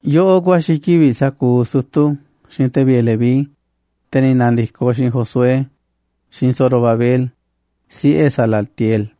Yoꞌoꞌ ku̱a̱xi̱ kivi̱ꞌ sa̱kuuꞌ sutu̱ xiinꞌ te̱ vi̱ꞌe̱ Leví, te̱ ni̱ na̱ndi̱koꞌ xiinꞌ Josué, xiinꞌ Zorobabel, siꞌe̱ Salatiel: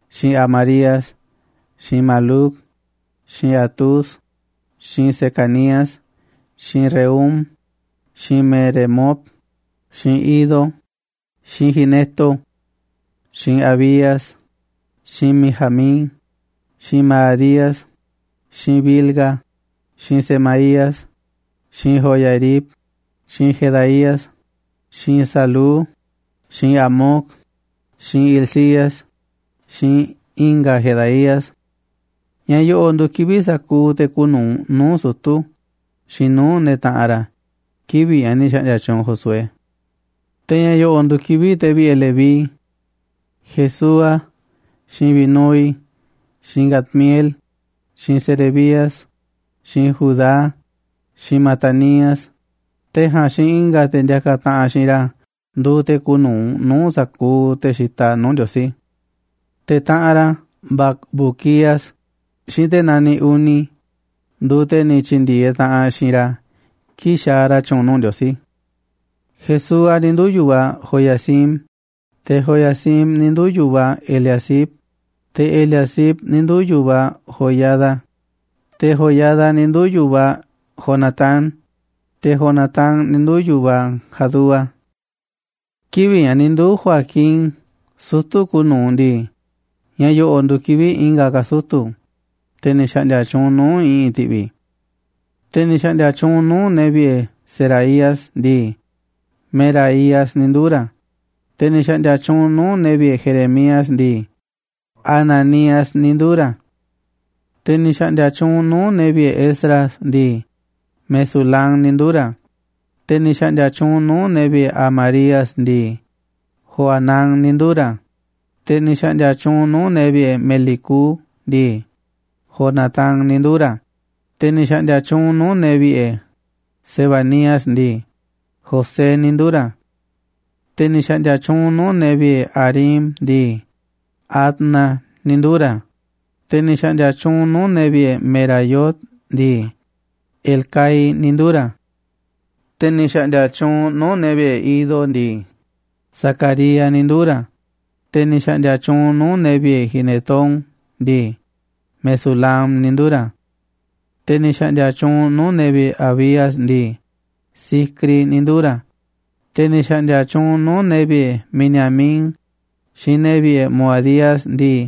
xiinꞌ Amarías xiinꞌ Maluc xiinꞌ Hatús xiinꞌ Secanías xiinꞌ Rehum xiinꞌ Meremot xiinꞌ Iddo xiinꞌ Gineto xiinꞌ Abías xiinꞌ Mijamín xiinꞌ Maadías xiinꞌ Bilga xiinꞌ Semaías xiinꞌ Joiarib xiinꞌ Jedaías xiinꞌ Salú xiinꞌ Amoc xiinꞌ Hilcías xiinꞌ i̱nga̱ Jedaías. Ña̱ yo̱ꞌo̱ꞌ nduuꞌ kivi̱ꞌ sa̱kuuꞌ te̱ kuuꞌ nu̱uꞌ nuu̱ꞌ sutu̱ xiinꞌ nuu̱ꞌ ne̱ taꞌanꞌ ra̱ kivi̱ꞌ ña̱ ni̱ xa̱ꞌndi̱a̱ tyuunꞌ Josué. Te̱ ña̱ yo̱ꞌo̱ꞌ nduuꞌ kivi̱ꞌ te̱ vi̱ꞌe̱ Leví: Jesúa xiinꞌ Binúi xiinꞌ Cadmiel xiinꞌ Serebías xiinꞌ Judá xiinꞌ Matanías, te̱ ja̱a̱nꞌ xiinꞌ i̱nga̱ te̱ ndiakaꞌ taꞌanꞌ xiinꞌ ra̱ nduuꞌ te̱ kuuꞌ nu̱uꞌ nuu̱ꞌ sa̱kuuꞌ te̱ xitaꞌ nuu̱ꞌ Ndiosí. Te̱ taꞌanꞌ ra̱ Bacbuquías xiinꞌ te̱ naniꞌ Uni nduuꞌ te̱ ni̱ tyi̱ndi̱e̱eꞌ taꞌanꞌ xiinꞌ ra̱ kii̱ꞌ xaaꞌ ra̱ tyu̱u̱n nuu̱ꞌ Ndiosí. Jesúa ni̱ nduu̱ yu̱vaꞌ Joiacim, te̱ Joiacim ni̱ nduu̱ yu̱vaꞌ Eliasib, te̱ Eliasib ni̱ nduu̱ yu̱vaꞌ Joiada, te̱ Joiada ni̱ nduu̱ yu̱vaꞌ Jonatán, te̱ Jonatán ni̱ nduu̱ yu̱vaꞌ Jadúa. Kivi̱ꞌ ña̱ ni̱ nduu̱ Joiacim sutu̱ kuuꞌ nu̱uꞌ ndii, ña̱ yo̱ꞌo̱ꞌ nduuꞌ kivi̱ꞌ i̱nga̱ ka̱ sutu̱, te̱ ni̱ xa̱ꞌndi̱a̱ tyuunꞌ nuu̱ꞌ i̱ꞌi̱n ti̱ꞌvi̱: Te̱ ni̱ xa̱ꞌndi̱a̱ tyuunꞌ nuu̱ꞌ ne̱ vi̱ꞌe̱ Seraías ndii, Meraías ni̱ nduu̱ ra̱, te̱ ni̱ xa̱ꞌndi̱a̱ tyuunꞌ nuu̱ꞌ ne̱ vi̱ꞌe̱ Jeremías ndii, Hananías ni̱ nduu̱ ra̱. Te̱ ni̱ xa̱ꞌndi̱a̱ tyuunꞌ nuu̱ꞌ ne̱ vi̱ꞌe̱ Esdras ndii, Mesulam ni̱ nduu̱ ra̱, te̱ ni̱ xa̱ꞌndi̱a̱ tyuunꞌ nuu̱ꞌ ne̱ vi̱ꞌe̱ Amarías ndii, Johanán ni̱ nduu̱ ra̱, Te̱ ni̱ xa̱ꞌndi̱a̱ tyuunꞌ nuu̱ꞌ ne̱ vi̱ꞌe̱ Melicú ndii, Jonatán ni̱ nduu̱ ra̱, te̱ ni̱ xa̱ꞌndi̱a̱ tyuunꞌ nuu̱ꞌ ne̱ vi̱ꞌe̱ Sebanías ndii, José ni̱ nduu̱ ra̱. Te̱ ni̱ xa̱ꞌndi̱a̱ tyuunꞌ nuu̱ꞌ ne̱ vi̱ꞌe̱ Harim ndii, Adna ni̱ nduu̱ ra̱, te̱ ni̱ xa̱ꞌndi̱a̱ tyuunꞌ nuu̱ꞌ ne̱ vi̱ꞌe̱ Meraiot ndii, Helcai ni̱ nduu̱ ra̱. Te̱ ni̱ xa̱ꞌndi̱a̱ tyuunꞌ nuu̱ꞌ ne̱ vi̱ꞌe̱ Iddo ndii, Zacarías ni̱ nduu̱ ra̱, te̱ ni̱ xa̱ꞌndi̱a̱ tyuunꞌ nuu̱ꞌ ne̱ vi̱ꞌe̱ Ginetón ndii, Mesulam ni̱ nduu̱ ra̱. Te̱ ni̱ xa̱ꞌndi̱a̱ tyuunꞌ nuu̱ꞌ ne̱ vi̱ꞌe̱ Abías ndii, Zicri ni̱ nduu̱ ra̱, te̱ ni̱ xa̱ꞌndi̱a̱ tyuunꞌ nuu̱ꞌ ne̱ vi̱ꞌe̱ Miniamín xiinꞌ ne̱ vi̱ꞌe̱ Moadías ndii,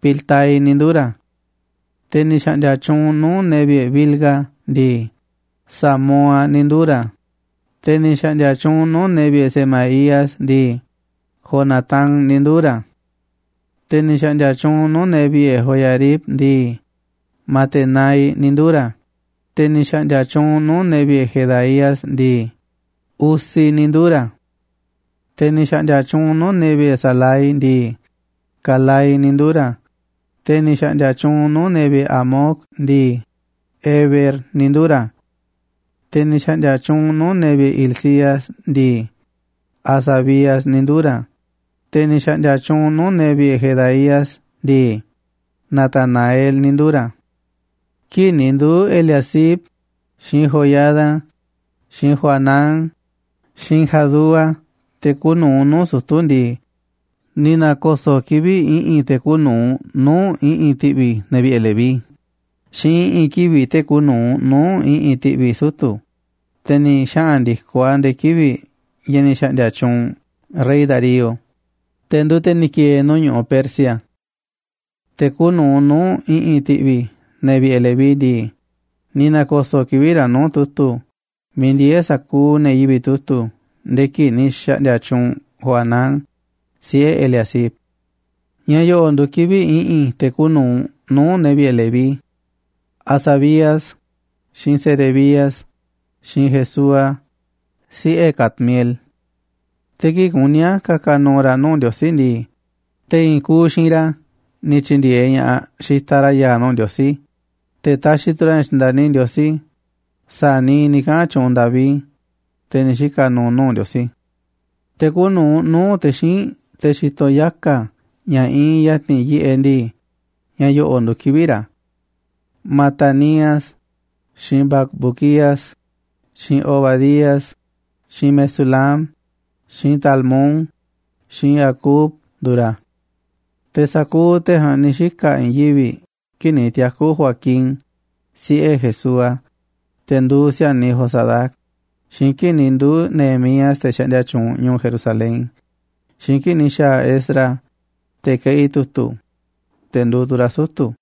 Piltai ni̱ nduu̱ ra̱. Te̱ ni̱ xa̱ꞌndi̱a̱ tyuunꞌ nuu̱ꞌ ne̱ vi̱ꞌe̱ Bilga ndii, Samúa ni̱ nduu̱ ra̱, te̱ ni̱ xa̱ꞌndi̱a̱ tyuunꞌ nuu̱ꞌ ne̱ vi̱ꞌe̱ Semaías ndii, Jonatán ni̱ nduu̱ ra̱. Te̱ ni̱ xa̱ꞌndi̱a̱ tyuunꞌ nuu̱ꞌ ne̱ vi̱ꞌe̱ Joiarib ndii, Matenai ni̱ nduu̱ ra̱, te̱ ni̱ xa̱ꞌndi̱a̱ tyuunꞌ nuu̱ꞌ ne̱ vi̱ꞌe̱ Jedaías ndii, Uzi ni̱ nduu̱ ra̱. Te̱ ni̱ xa̱ꞌndi̱a̱ tyuunꞌ nuu̱ꞌ ne̱ vi̱ꞌe̱ Salai ndii, Calai ni̱ nduu̱ ra̱, te̱ ni̱ xa̱ꞌndi̱a̱ tyuunꞌ nuu̱ꞌ ne̱ vi̱ꞌe̱ Amoc ndii, Eber ni̱ nduu̱ ra̱. Te̱ ni̱ xa̱ꞌndi̱a̱ tyuunꞌ nuu̱ꞌ ne̱ vi̱ꞌe̱ Hilcías ndii, Hasabías ni̱ nduu̱ ra̱, te̱ ni̱ xa̱ꞌndi̱a̱ tyuunꞌ nuu̱ꞌ ne̱ vi̱ꞌe̱ Jedaías ndii, Natanael ni̱ nduu̱ ra̱. Kii̱ꞌ ni̱ nduu̱ Eliasib, xiinꞌ Joiada, xiinꞌ Johanán, xiinꞌ Jadúa te̱ kuuꞌ nu̱uꞌ nuu̱ꞌ sutu̱ ndii, ni̱ na̱ko̱so̱ꞌ kivi̱ꞌ i̱ꞌi̱n te̱ kuuꞌ nu̱uꞌ nuu̱ꞌ i̱ꞌi̱n ti̱ꞌvi̱ ne̱ vi̱ꞌe̱ Leví, xiinꞌ i̱ꞌi̱n kivi̱ꞌ te̱ kuuꞌ nu̱uꞌ nuu̱ꞌ i̱ꞌi̱n ti̱ꞌvi̱ sutu̱, te̱ ni̱ xaꞌa̱n ndi̱koꞌ a̱ nde̱e̱ kivi̱ꞌ ña̱ ni̱ xa̱ꞌndi̱a̱ tyuunꞌ rey Darío, te̱ nduuꞌ te̱ ni̱ ki̱e̱e̱ nuu̱ꞌ ñu̱ꞌuꞌ Persia. Te̱ kuuꞌ nu̱uꞌ nuu̱ꞌ i̱ꞌi̱n ti̱ꞌvi̱ ne̱ vi̱ꞌe̱ Leví ndii, ni̱ na̱ko̱so̱ꞌ kivi̱ꞌ ra̱ nuu̱ꞌ tu̱tu̱ miiꞌ ndieé sa̱kuuꞌ ne̱ yivi̱ꞌ tu̱tu̱ nde̱e̱ kii̱ꞌ ni̱ xa̱ꞌndi̱a̱ tyuunꞌ Johanán, siꞌe̱ Eliasib. Ña̱ yo̱ꞌo̱ꞌ nduuꞌ kivi̱ꞌ i̱ꞌi̱n te̱ kuuꞌ nu̱uꞌ nuu̱ꞌ ne̱ vi̱ꞌe̱ Leví: Hasabías, xiinꞌ Serebías, xiinꞌ Jesúa, siꞌe̱ Cadmiel. Te̱ kii̱ꞌ kuní a̱ ka̱ka̱ nu̱u̱ ra̱ nuu̱ꞌ Ndiosí ndii, te̱ i̱i̱n kuuꞌ xiinꞌ ra̱ ni̱ tyi̱ndi̱e̱eꞌ ña̱ꞌaꞌ xitaꞌ ra̱ ya̱a̱ nuu̱ꞌ Ndiosí, te̱ taxiꞌ tu̱ ra̱ ña̱ tyi̱nda̱ni Ndiosí, sa̱a̱ niiꞌ ni̱ kaꞌa̱n tyuunꞌ David, te̱ ni̱ xika̱ nuuꞌ nu̱u̱ Ndiosí. Te̱ kuuꞌ nu̱uꞌ nuu̱ꞌ te̱ xíinꞌ, te̱ xitoꞌ yaka̱ ña̱ iinꞌ ya̱ti̱n yiꞌeꞌ ndii, ña̱ yo̱ꞌo̱ꞌ nduuꞌ kivi̱ꞌ ra̱: Matanías, xiinꞌ Bacbuquías, xiinꞌ Obadías, xiinꞌ Mesulam, xiinꞌ Talmón, xiinꞌ Acub nduuꞌ ra̱. Te̱ sa̱kuuꞌ te̱ ja̱a̱nꞌ ni̱ xika̱ i̱i̱n yivi̱ꞌ kii̱ꞌ ni̱ tiaku̱ Joacim, siꞌe̱ Jesúa, te̱ nduuꞌ si̱a̱niꞌ Josadac, xiinꞌ kii̱ꞌ ni̱ nduu̱ Nehemías, te̱ xaꞌndia tyuunꞌ ñu̱u̱ Jerusalén, xiinꞌ kii̱ꞌ ni̱ xa̱a̱ Esdras, te̱ keꞌi tu̱tu̱, te̱ nduuꞌ tu̱ ra̱ sutu̱.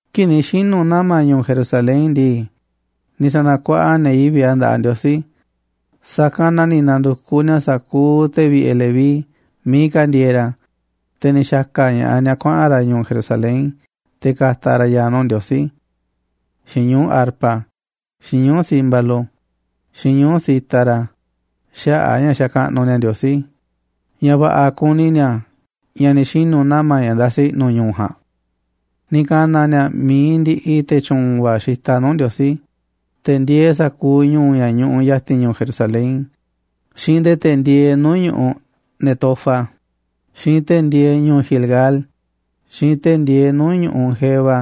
Kii̱ꞌ ni̱ xinu̱ nama̱ ñu̱u̱ Jerusalén ndii, ni̱ sa̱na̱kuaꞌa ne̱ yivi̱ꞌ a̱ nda̱ꞌaꞌ Ndiosí, sa̱kanꞌ na ni̱ na̱ndu̱kuꞌ ni̱a̱ sa̱kuuꞌ te̱ vi̱ꞌe̱ Leví miiꞌ ka̱ ndieeꞌ ra̱, te̱ ni̱ xa̱ka̱ ña̱ꞌaꞌ ni̱a̱ kuaꞌa̱n ra̱ ñu̱u̱ Jerusalén te̱ ka̱ta̱ ra̱ ya̱a̱ nuu̱ꞌ Ndiosí xiinꞌ ñuu̱ꞌ arpa, xiinꞌ ñuu̱ꞌ címbalo, xiinꞌ ñuu̱ꞌ cítara xaꞌa̱ꞌ a̱ ña̱ xakaꞌnuꞌ ni̱a̱ Ndiosí ña̱ va̱ꞌa̱ kuni ni̱a̱ ña̱ ni̱ xinu̱ nama̱ ña̱ ndasi i̱ꞌnu̱ ñu̱u̱ ja̱a̱nꞌ. Ni̱ ka̱na̱ ni̱a̱ mi̱iꞌ ndi̱ꞌi̱ te̱ tyu̱u̱n va̱ xitaꞌ nuu̱ꞌ Ndiosí, te̱ ndieeꞌ sa̱kuuꞌ ñu̱u̱ ña̱ ñuꞌuꞌ ya̱ti̱n ñu̱u̱ Jerusalén, xiinꞌ nde̱e̱ te̱ ndieeꞌ nuu̱ꞌ ñu̱ꞌuꞌ Netofa, xiinꞌ te̱ ndieeꞌ ñu̱u̱ Gilgal, xiinꞌ te̱ ndieeꞌ nuu̱ꞌ ñu̱ꞌuꞌ Geba,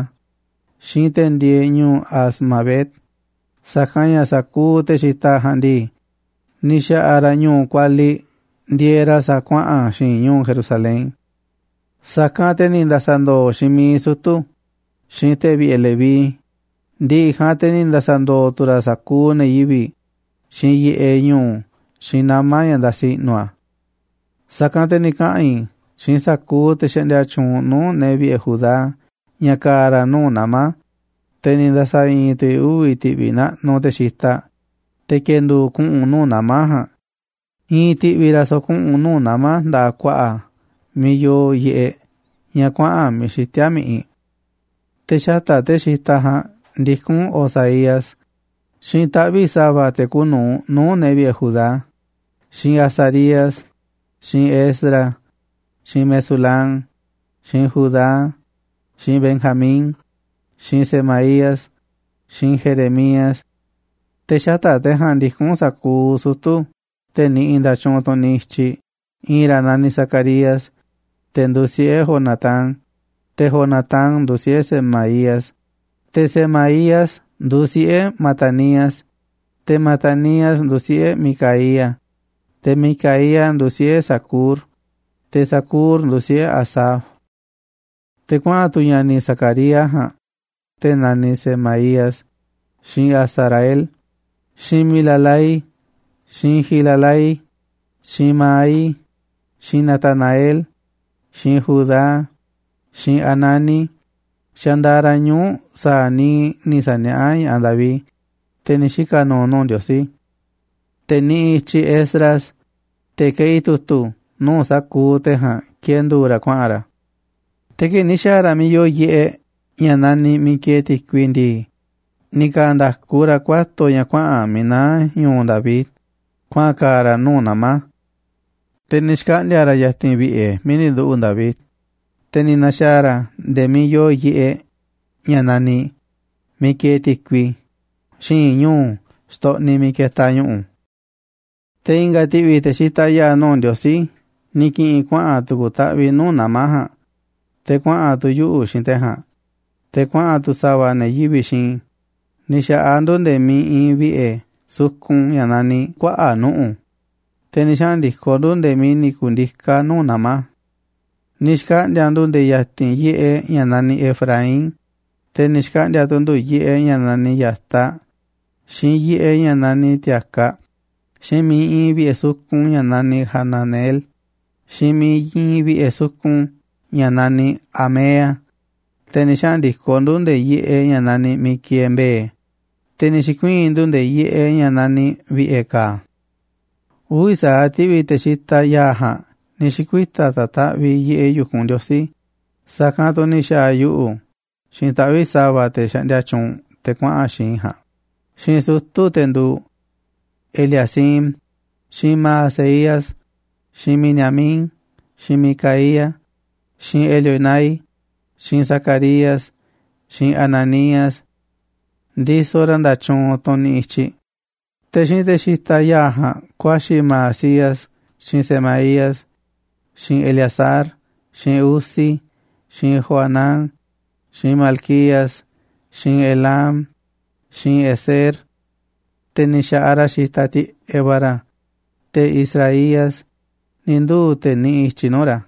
xiinꞌ te̱ ndieeꞌ ñu̱u̱ Azmavet, sa̱kanꞌ ña̱ sa̱kuuꞌ te̱ xitaꞌ ja̱a̱nꞌ ndii, ni̱ xa̱ꞌa̱ ra̱ ñu̱u̱ kualiꞌ ndieeꞌ ra̱ sa̱a̱ kuaꞌa̱n xi̱i̱nꞌ ñu̱u̱ Jerusalén. Sa̱kanꞌ te̱ ni̱ nda̱sa̱ndo̱o̱ xiinꞌ miiꞌ sutu̱, xiinꞌ te̱ vi̱ꞌe̱ Leví, ndi̱ꞌi̱ ja̱a̱nꞌ te̱ ni̱ nda̱sa̱ndo̱o̱ tu̱ ra̱ sa̱kuuꞌ ne̱ yivi̱ꞌ, xiinꞌ yiꞌeꞌ ñu̱u̱, xiinꞌ nama̱ ña̱ ndasi i̱ꞌnu̱ a̱. Sa̱kanꞌ te̱ ni̱ kaꞌa̱n i̱ xiinꞌ sa̱kuuꞌ te̱ xaꞌndia tyuunꞌ nuu̱ꞌ ne̱ vi̱ꞌe̱ Judá ña̱ ka̱a̱ ra̱ nuu̱ꞌ nama̱, te̱ ni̱ nda̱sa̱i̱i̱n tu̱ i̱ uvi̱ ti̱ꞌvi̱ naꞌnuꞌ te̱ xitaꞌ, te̱ ki̱e̱ndu̱u̱ kuꞌu̱n nuu̱ꞌ nama̱ ja̱a̱nꞌ, i̱i̱n ti̱ꞌvi̱ ra̱ so̱ꞌo̱ kuꞌu̱n nuu̱ꞌ nama̱ nda̱ꞌaꞌ ku̱a̱ꞌa̱ a̱ miiꞌ yoo yiꞌeꞌ ña̱ kuaꞌa̱n Miiꞌ Xitíá Mi̱ꞌiꞌ. Te̱ xata̱ꞌ te̱ xitaꞌ ja̱a̱nꞌ ndikún Osaías, xiinꞌ taꞌvi̱ꞌ sa̱va̱ te̱ kuuꞌ nu̱uꞌ nuu̱ꞌ ne̱ vi̱ꞌe̱ Judá, xiinꞌ Azarías, xiinꞌ Esdras xiinꞌ Mesulam, xiinꞌ Judá, xiinꞌ Benjamín xiinꞌ Semaías xiinꞌ Jeremías. Te̱ xata̱ꞌ te̱ ja̱a̱nꞌ ndikún sa̱kuuꞌ sutu̱ te̱ niꞌiꞌ nda̱tyuunꞌ tunꞌ niꞌiꞌ i̱tyiꞌ, i̱i̱n ra̱ naniꞌ Zacarías, te̱ nduuꞌ siꞌe̱ Jonatán, te̱ Jonatán nduuꞌ siꞌe̱ Semaías, te̱ Semaías nduuꞌ siꞌe̱ Matanías, te̱ Matanías nduuꞌ siꞌe̱ Micaías, te̱ Micaías nduuꞌ siꞌe̱ Zacur, te̱ Zacur nduuꞌ siꞌe̱ Asaf. Te̱ kuaꞌa̱n tu̱ ña̱ni̱ Zacarías ja̱a̱nꞌ, te̱ naniꞌ Semaías, xiinꞌ Azarael, xiinꞌ Milalai xiinꞌ Gilalai, xiinꞌ Maai xiinꞌ Natanael xiinꞌ Judá xiinꞌ Hanani xandaaꞌ ra̱ ñuu̱ꞌ sa̱a̱ niiꞌ ni̱ sa̱niaꞌá ña̱ꞌaꞌ David, te̱ ni̱ xika̱ nuuꞌ nuu̱ꞌ Ndiosí. Te̱ niꞌiꞌ i̱tyiꞌ Esdras, te̱ keꞌi tu̱tu̱, nuu̱ꞌ sa̱kuuꞌ te̱ ja̱a̱nꞌ ki̱e̱ndu̱u̱ ra̱ kuaꞌa̱n ra̱. Te̱ kii̱ꞌ ni̱ xa̱a̱ ra̱ miiꞌ yoo yiꞌeꞌ ña̱ naniꞌ Ti̱ko̱ꞌyoꞌ ndii, ni̱ ka̱a̱ nda̱ku ra̱ kuato̱ ña̱ kuaꞌa̱n miiꞌ naá ñu̱u̱ David kuaꞌa̱n ka̱a̱ ra̱ nuu̱ꞌ nama̱. Te̱ ni̱ xkaꞌndi̱a̱ ra̱ ya̱ti̱n vi̱ꞌe̱ miiꞌ ni̱ nduꞌu̱ꞌ David, te̱ ni̱ na̱xa̱a̱ ra̱ nde̱e̱ miiꞌ yoo yiꞌeꞌ ña̱ naniꞌ Miiꞌ Kieeꞌ Ti̱kui, xi̱i̱nꞌ ñu̱u̱ xtoꞌniꞌ miiꞌ ketaꞌ ñu̱ꞌu̱. Te̱ i̱nga̱ ti̱ꞌvi̱ te̱ xitaꞌ ya̱a̱ nuu̱ꞌ Ndiosí ni̱ ki̱ꞌi̱n kuaꞌa̱n tu̱ku̱ taꞌviꞌ nuu̱ꞌ nama̱ ja̱a̱nꞌ, te̱ kuaꞌa̱n tu̱ yuꞌu̱ xiinꞌ te̱ ja̱a̱nꞌ, te̱ kuaꞌa̱n tu̱ sa̱va̱ ne̱ yivi̱ꞌ xiinꞌ i̱, ni̱ xa̱ꞌaꞌ ndu̱ nde̱e̱ miiꞌ iinꞌ vi̱ꞌe̱ sukun ña̱ naniꞌ Kuaꞌa̱ꞌ Nuꞌu̱, te̱ ni̱ xaꞌa̱n ndi̱koꞌ ndu̱ nde̱e̱ miiꞌ ni̱ ku̱ndiká nuu̱ꞌ nama̱. Ni̱ xkaꞌndi̱a̱ ndu̱ nde̱e̱ ya̱ti̱n yiꞌeꞌ ña̱ naniꞌ Efraín, te̱ ni̱ xkaꞌndi̱a̱ tu̱ ndu̱ yiꞌeꞌ ña̱ naniꞌ Ya̱taꞌ, xiinꞌ yiꞌeꞌ ña̱ naniꞌ Ti̱a̱kaꞌ, xiinꞌ miiꞌ iinꞌ vi̱ꞌe̱ sukun ña̱ naniꞌ Hananeel, xiinꞌ miiꞌ iinꞌ vi̱ꞌe̱ sukun ña̱ naniꞌ Hamea, te̱ ni̱ xaꞌa̱n ndi̱koꞌ ndu̱ nde̱e̱ yiꞌeꞌ ña̱ naniꞌ miiꞌ kieeꞌ Mbe̱e̱, te̱ ni̱ xi̱kuii̱n ndu̱ nde̱e̱ yiꞌeꞌ ña̱ naniꞌ Vi̱ꞌe̱ Ka̱a̱. Uvi̱ sa̱aꞌ ti̱ꞌvi̱ te̱ xitaꞌ ya̱a̱ ja̱a̱nꞌ ni̱ xi̱kuita̱ ta̱taꞌviꞌ yiꞌeꞌ yu̱kunꞌ Ndiosí, sa̱kanꞌ tu̱ ni̱ xa̱a̱ yuꞌu̱ xiinꞌ taꞌvi̱ꞌ sa̱va̱ te̱ xaꞌndia tyuunꞌ te̱ kuaꞌa̱n xiinꞌ i̱ ja̱a̱nꞌ, xiinꞌ sutu̱, te̱ nduuꞌ: Eliacim, xiinꞌ Maaseías xiinꞌ Miniamín xiinꞌ Micaías xiinꞌ Elioenai xiinꞌ Zacarías xiinꞌ Hananías ndisoꞌ ra̱ nda̱tyuunꞌ tunꞌ niꞌiꞌ i̱tyiꞌ, te̱ xiinꞌ te̱ xitaꞌ ya̱a̱ ja̱a̱nꞌ ku̱a̱xi̱ Maasías xiinꞌ Semaías xiinꞌ Eleazar xiinꞌ Uzi xiinꞌ Johanán xiinꞌ Malquías xiinꞌ Elam xiinꞌ Ezer. Te̱ ni̱ xa̱ꞌaꞌ ra̱ xitaꞌ tiꞌeꞌ va̱ ra̱, te̱ Izrahías ni̱ nduu̱ te̱ niꞌiꞌ i̱tyiꞌ nuu̱ꞌ ra̱.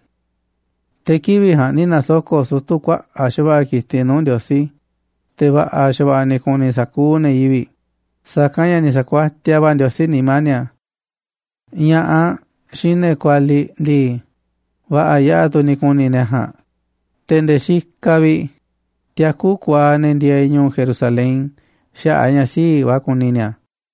Te̱ kivi̱ꞌ ja̱a̱nꞌ ni̱ na̱soko̱ꞌ sutu̱ kuaꞌa̱ꞌ xa̱va̱ꞌa̱ ki̱tiꞌ nuu̱ꞌ Ndiosí, te̱ va̱ꞌa̱ xa̱va̱ꞌa̱ ni̱ ku̱ni̱ sa̱kuuꞌ ne̱ yivi̱ꞌ, sa̱kanꞌ ña̱ ni̱ sa̱ku̱a̱tiaꞌ va̱ Ndiosí nimá ni̱a̱. Ña̱ꞌaꞌ xiinꞌ ne̱ kualiꞌ ndii, va̱ꞌa̱ yaꞌa̱ tu̱ ni̱ ku̱ni̱ ne̱ ja̱a̱nꞌ, te̱ nde̱e̱ xikaꞌ vi̱ꞌ tiakú kuaaꞌ ne̱ ndieeꞌ ñu̱u̱ Jerusalén xaꞌa̱ꞌ a̱ ña̱ sii̱ꞌ va̱ kuni ni̱a̱.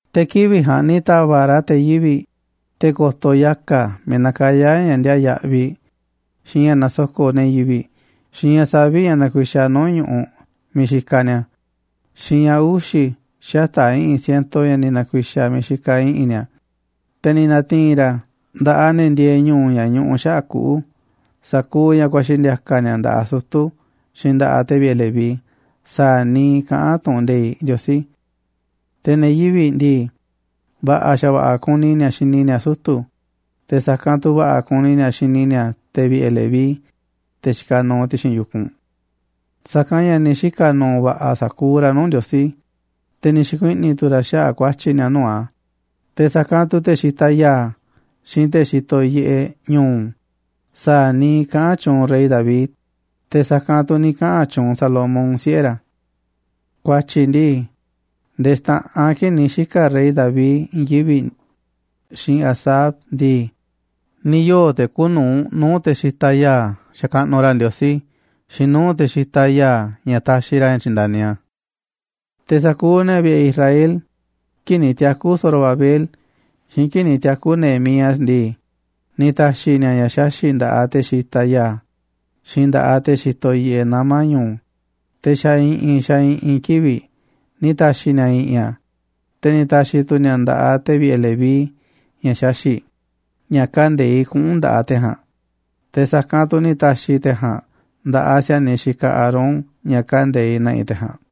Te̱ kivi̱ꞌ ja̱a̱nꞌ ni̱ ta̱va̱ꞌ ra̱ te̱ yivi̱ꞌ, te̱ ko̱to̱ yaka̱ miiꞌ nakayá ña̱ ndiaa yaꞌviꞌ, xiinꞌ ña̱ nasoko̱ꞌ ne̱ yivi̱ꞌ, xiinꞌ ña̱ saviꞌ ña̱ nakuixaꞌ nu̱uꞌ ñu̱ꞌuꞌ miiꞌ xikaꞌ ni̱a̱, xiinꞌ ña̱ uxi̱ xata̱ꞌ i̱ꞌi̱n siento ña̱ ni̱ na̱ku̱i̱xa̱ miiꞌ xikaꞌ i̱ꞌi̱n ni̱a̱. Te̱ ni̱ na̱ti̱i̱n ra̱ nda̱ꞌaꞌ ne̱ ndieeꞌ ñu̱u̱ ña̱ ñuꞌuꞌ xaꞌa̱ꞌ kuꞌu̱ sa̱kuuꞌ ña̱ ku̱a̱xi̱ ndi̱a̱ka̱ ni̱a̱ nda̱ꞌaꞌ sutu̱ xiinꞌ nda̱ꞌaꞌ te̱ vi̱ꞌe̱ Leví sa̱a̱ niiꞌ kaꞌán tu̱ꞌu̱n nde̱iꞌ Ndiosí. Te̱ ne̱ Judá ndii, va̱ꞌa̱ xa̱va̱ꞌa̱ kuni ni̱a̱ xini ni̱a̱ sutu̱, te̱ sa̱kanꞌ tu̱ va̱ꞌa̱ kuni ni̱a̱ xini ni̱a̱ te̱ vi̱ꞌe̱ Leví, te̱ xikaꞌ nuuꞌ ti̱xi̱n yu̱kunꞌ. Sa̱kanꞌ ña̱ ni̱ xika̱ nu̱u̱ va̱ꞌa̱ sa̱kuuꞌ ra̱ nuu̱ꞌ Ndiosí, te̱ ni̱ xi̱kuiꞌni̱ tu̱ ra̱ xaꞌa̱ꞌ ku̱a̱tyi̱ ni̱a̱ nuu̱ꞌ a̱, te̱ sa̱kanꞌ tu̱ te̱ xitaꞌ ya̱a̱, xiinꞌ te̱ xitoꞌ yiꞌeꞌ ñu̱u̱ sa̱a̱ niiꞌ kaꞌán tyuunꞌ rey David, te̱ sa̱kanꞌ tu̱ ni̱ kaꞌa̱n tyuunꞌ Salomón, siꞌe̱ ra̱. Ku̱a̱tyi̱ ndii, nde̱e̱ xta̱ꞌanꞌ kii̱ꞌ ni̱ xika̱ rey David i̱i̱n yivi̱ꞌ, xiinꞌ Asaf ndii, ni̱ yoo̱ te̱ kuuꞌ nu̱uꞌ nuu̱ꞌ te̱ xitaꞌ ya̱a̱ xakaꞌnuꞌ ra̱ Ndiosí xiinꞌ nuu̱ꞌ te̱ xitaꞌ ya̱a̱ ña̱ taxiꞌ ra̱ ña̱ tyi̱nda̱ni a̱. Te̱ sa̱kuuꞌ ne̱ vi̱ꞌe̱ Israel kii̱ꞌ ni̱ tiaku̱ Zorobabel xiinꞌ kii̱ꞌ ni̱ tiaku̱ Nehemías ndii, ni̱ ta̱xi̱ ni̱a̱ ña̱ xaxi̱ꞌ nda̱ꞌaꞌ te̱ xitaꞌ ya̱a̱ xiinꞌ nda̱ꞌaꞌ te̱ xitoꞌ yiꞌeꞌ nama̱ ñu̱u̱, te̱ xa̱ i̱ꞌi̱n xa̱ i̱ꞌi̱n kivi̱ꞌ ni̱ ta̱xi̱ ni̱a̱ i̱ꞌi̱n a̱, te̱ ni̱ ta̱xi̱ tu̱ ni̱a̱ a̱ nda̱ꞌaꞌ te̱ vi̱ꞌe̱ Leví ña̱ xaxi̱ꞌ ña̱ kande̱iꞌ kuꞌu̱n nda̱ꞌaꞌ te̱ ja̱a̱nꞌ, te̱ sa̱kanꞌ tu̱ ni̱ ta̱xi̱ te̱ ja̱a̱nꞌ nda̱ꞌaꞌ si̱a̱niꞌ xikaꞌ Aarón ña̱ kande̱iꞌ na̱ꞌi̱ te̱ ja̱a̱nꞌ.